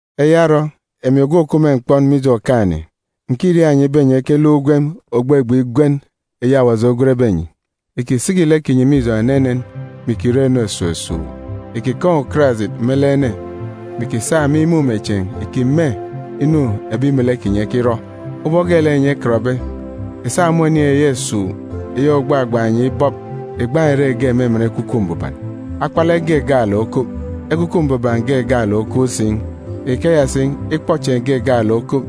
Eya orọ, emi ogwu òkup me mkpọn mije Okaan̄-ene, ǹkiriaak enyi ibe enyi ekeluk ugwem ògbegbe igwen eyi Awaji ogwenbe enyi. Ìkisiki lek kinyi me ijọn̄ enenen, mè ìkirọ inu esuuk esuuk. Ìkikaan̄ ukarajit me lek ene, mè ìkisa me imumechieen̄ ìkime inu ebi melek kinyi ekirọ. Ubọk geelek enyi ekọtbe, ìsa me oniin̄ eyi esuuk eyi ògbagbaan̄ enyi ibọp, ìgbaan̄ ìre ge me emen Ekwukwu Mbuban. Akpalek ge gaalek okup, Ekwukwu Mbuban ge gaalek si okup. Ikeya si, ikpọchieen̄ ge gaalek okup,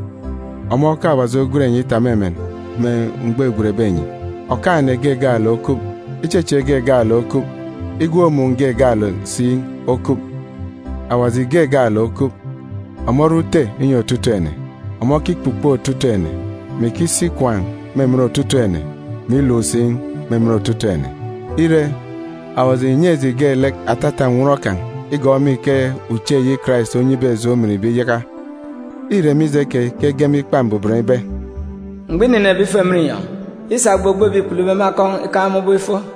ọmọ ke Awaji ogwen enyi itap me emen me mgbọ îgwenbe enyi. Okaan̄-ene ge gaalek okup, ichechieek ge gaalek okup, igwook-mun̄ ge gaalek si okup. Awaji ge gaalek okup, ọmọ ore Ute inyi otutuuk ene. Ọmọ okikpukpo otutuuk ene, mè ikisi ikwaan̄ me emen otutuuk ene, mè iluk si me emen otutuuk ene. Ire, Awaji ìnyi eji geelek atata nnwọn kan̄ igọọk me ike uche eyi Karais onyibe eji ominbe iyaka. Îre mije keyi ke ege me Ikpa Mbuban ibe: “Mgbọ înenebe ifo emen inyọn̄, îsa ogbogbo ebi îkpulube me akọn̄ ikaan̄ me ubọk ifo,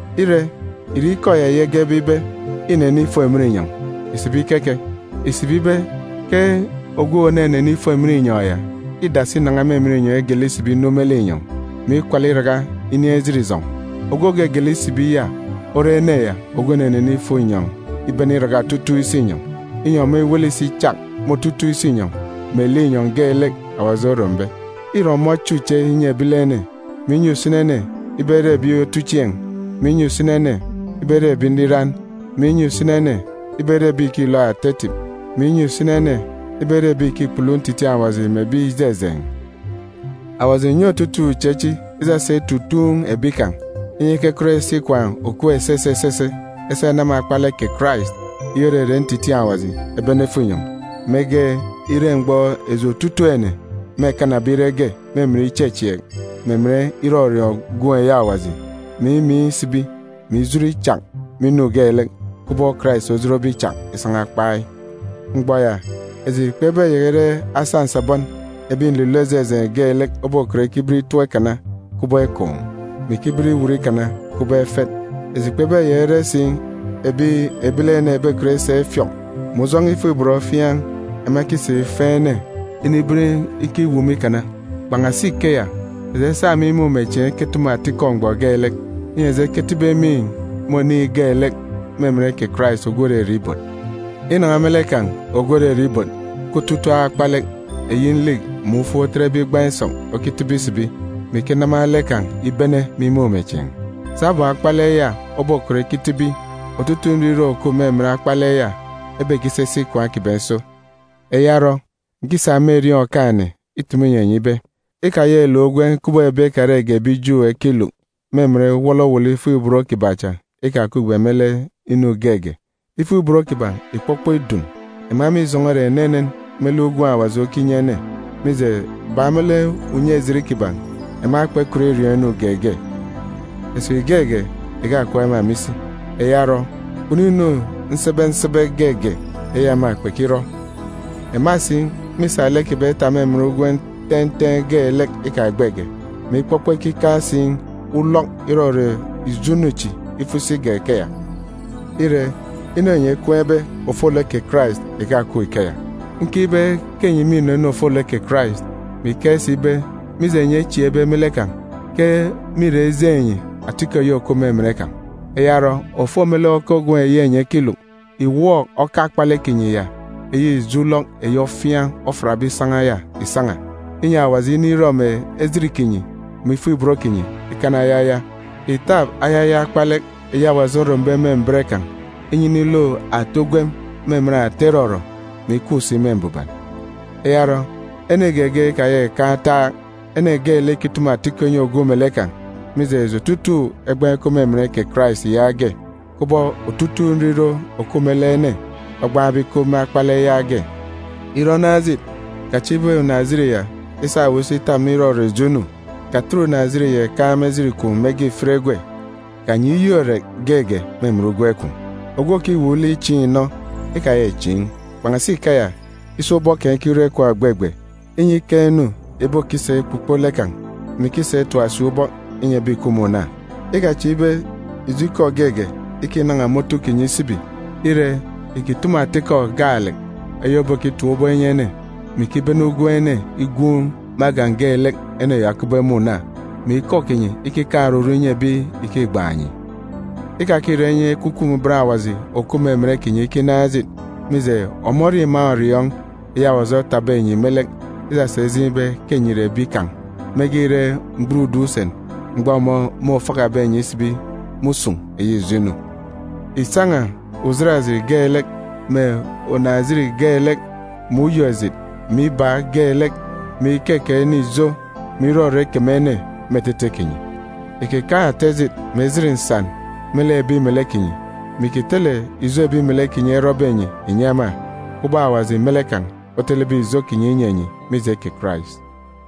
(Ire, ìre ikọ ya eyi egebe ibe, “Înene ifo emen inyọn̄” ìsibi keke? Ìsibi ibe ke ogwu ònenene ifo emen inyọn̄ ya îdasi inan̄a me emen inyọn̄ igele isibi inu me linyọn̄, mè ikwala iraka inin̄ ejit ijọn̄. Ogwu ògegele isibi ya ore ene ya ogwu ònenene ifo inyọn̄ ibene iraka otutuuk isinyọn̄, inyi ọmọ iwele isi ichak me otutuuk isinyọn̄ mè linyọn̄ geelek Awaji orombe.) Îre ọmọ oche uche inyi ebilene, mè inyi usini ene ibe ere ebi otuchieen̄, mè inyi usini ene ibe ere ebi nriran, mè inyi usini ene ibe ere ebi ìkilook ata etip, mè inyi usini ene ibe ere ebi ìkikpulu ntitiin̄ Awaji mè ebi ijejeen̄. Awaji ìnyi otutuuk uche chi isasa itutuun̄ ebi kan̄, inyi ekekọt esi ikwaan̄ òkup esese esese esa enama akpalek kè Karais, eyi òrere ntitiin̄ Awaji, ebene efo inyọn̄, mege ire mgbọ eji otutuuk ene mêkanabe ire ge me emen ichechieek mè emen irọriọọn̄ Gwun̄ eyi Awaji, mè imiin̄ isibi, mè ijot ichak me inu geelek, kubọk Karais ojotbe ichak isan̄a kpai. Mgbọ ya, eji kpebeyaka ire asa nsabọn ebi nlilọ ijejeen̄ geelek obokọt ikiben itọp ikana kubọk ekoon̄, mè ikiben iwut ikana kubọk efet. Eji kpebeyaka ire si ebi ebilene ebekọt isa ifiọk mè ujọn̄ọ ifuk-ibot ofiaan̄ ema ekisa ifeen̄ ene iniben ikiwumu ikana. Kpan̄asi ikeya, eji esa me imumechieen̄ eketumu atikọ mgbọ geelek, inyi eji eketibi emiin̄ me oniin̄ geelek me emen kè Karais ogwu òrere Ibot. Inan̄a me lek kan̄, ogwu òrere Ibot, ke otutuuk akpalek, eyi nlik mè ufuk otetbe igbaan̄ isọk, okitibi isibi, mè ikinama lek kan̄ ibene me imumechieen̄. Sabum akpalek ya obokọt ikitibi, otutuuk nriro òkup me emen akpalek ya ebekisisi ikwaan̄ kiban̄ iso. Eya orọ, ǹkisa me erieen̄ Okaan̄-ene itumu inyi enyi ibe: Ikayaka ìluk ugwem kubọk ebi ekarege ebi Ju ekiluk me emen wọlọwọlọ ifuk-ibot kiban̄ cha ikakupge me lek inu geege. Ifuk-ibot kiban̄ ìkpọkpọ idun. Ema mîjọn̄ọ ere enenen me lek ugwem Awaji okinyi ene, mije, bak me lek unye-ejit kiban̄, ema kpekọt iriọọn̄ inu geege. Esip geege ìkakup ema me isi. Eya orọ, kpunu nsebe nsebe inu geege eyi ema kpekirọ. Ema si mîsa lek kiban̄ itap me emen ugwem ten̄ten̄ geelek ikagbege, mè ikpọkpọ ikikaan̄ si ulọk irọrọ ijo inu chi ifo isi igak ikeya. Ire, inu enyi ekween̄be ofolek kè Karais ìkakup ikeya. Nkeek ibe ke enyi mînọ inu ofolek kè Karais, mè ikeek si ibe, mije enyi echieekbe me lek kan̄, ke mîra ijeen̄ enyi atikọ eyi òkup me emen kan̄. Eya orọ, òfo me lek oka ugwem eyi enyi ekiluk, ìwọọk oka akpalek kinyi ya, eyi ijo ulọk eyi ofiaan̄ ofiatbe isan̄a ya, ìsan̄a, inyi Awaji inirọ mè ejit kinyi mè ifuk-ibot kinyi ikana ayaya. Ìtap ayaya akpalek eyi Awaji orombe me mbet kan̄, ibe iniluk ata ugwem me emen ata irọrọ, mè ikup si me mbuban. Eya orọ, ene geege ikayaka ìkan̄ ataak! Ene geelek ikitumu atikọ inyi ogwu melek kan̄, mije, eji otutuuk egbaan̄ ikup me emen kè Karais yaage, kubọk otutuuk nriro òkup me lek ene ogbaan̄be ikup me akpalek yaage. Ire onaan̄ ejit, kachieek ibe unaan̄-ejit ya isa owu isi itap me irọrọ ijo inu.b Katet unaan̄-ejit ya ìkaan̄ me ejit kwun̄ mege ìfit egwe, inyi owu okanyi Yọk irek geege me emen ugwem kwun̄. Ogwu òkiwuuk lek ichiin̄ inọ, ikayaka ìchiin̄. Kpan̄asi ikeya, isa ubọk kan̄ ikirọ ikwaan̄ ògbegbe, inyi ikaan̄ inu ìbokisa ikpukpo lek kan̄, mè ikisa itap si ubọk inyi ebi ìkup me una. Ikachieek ibe ijo ikọ geege ikinan̄a me otu kinyi isibi. Ire, ìkitumu ata ikọ gaalek eyi òbokitap ubọk inyi ene, mè ikibene ugwem ene igwuun̄ me agan̄ geelek ene ya okupbe me una, mè ikọ kinyi ikikaan̄ oruru inyi ebi ìkigban̄ enyi. Ikakirọ inyi Ekwukwu Mbuban Awaji òkup me emen kinyi ikinaan̄ ejit, mije, ọmọ ore iman̄ òriọọn̄ eyi Awaji otapbe enyi me lek, isasa ijeen̄ ibe ke enyi ìre ebi kan̄ mege ire mgburudun̄ usen, mgbọ ọmọ môfakabe enyi isibi me usun̄ eyi ijo inu. Ìsan̄a ujat ejit geelek, mè unaan̄-ejit geelek, mè uyok-ejit, mè ibaak geelek, mè ikekeek ene ijo, mè irọrọ ikeme ene, me etete kinyi. Ìkikaan̄ ata ejit mè ejit nsan me lek ebi melek kinyi, mè ìkitele ijo ebi melek kinyi erọbe enyi ìnyi ema, kubọk Awaji me lek kan̄ otelebe ijo kinyi inyi enyi mije kè Karais.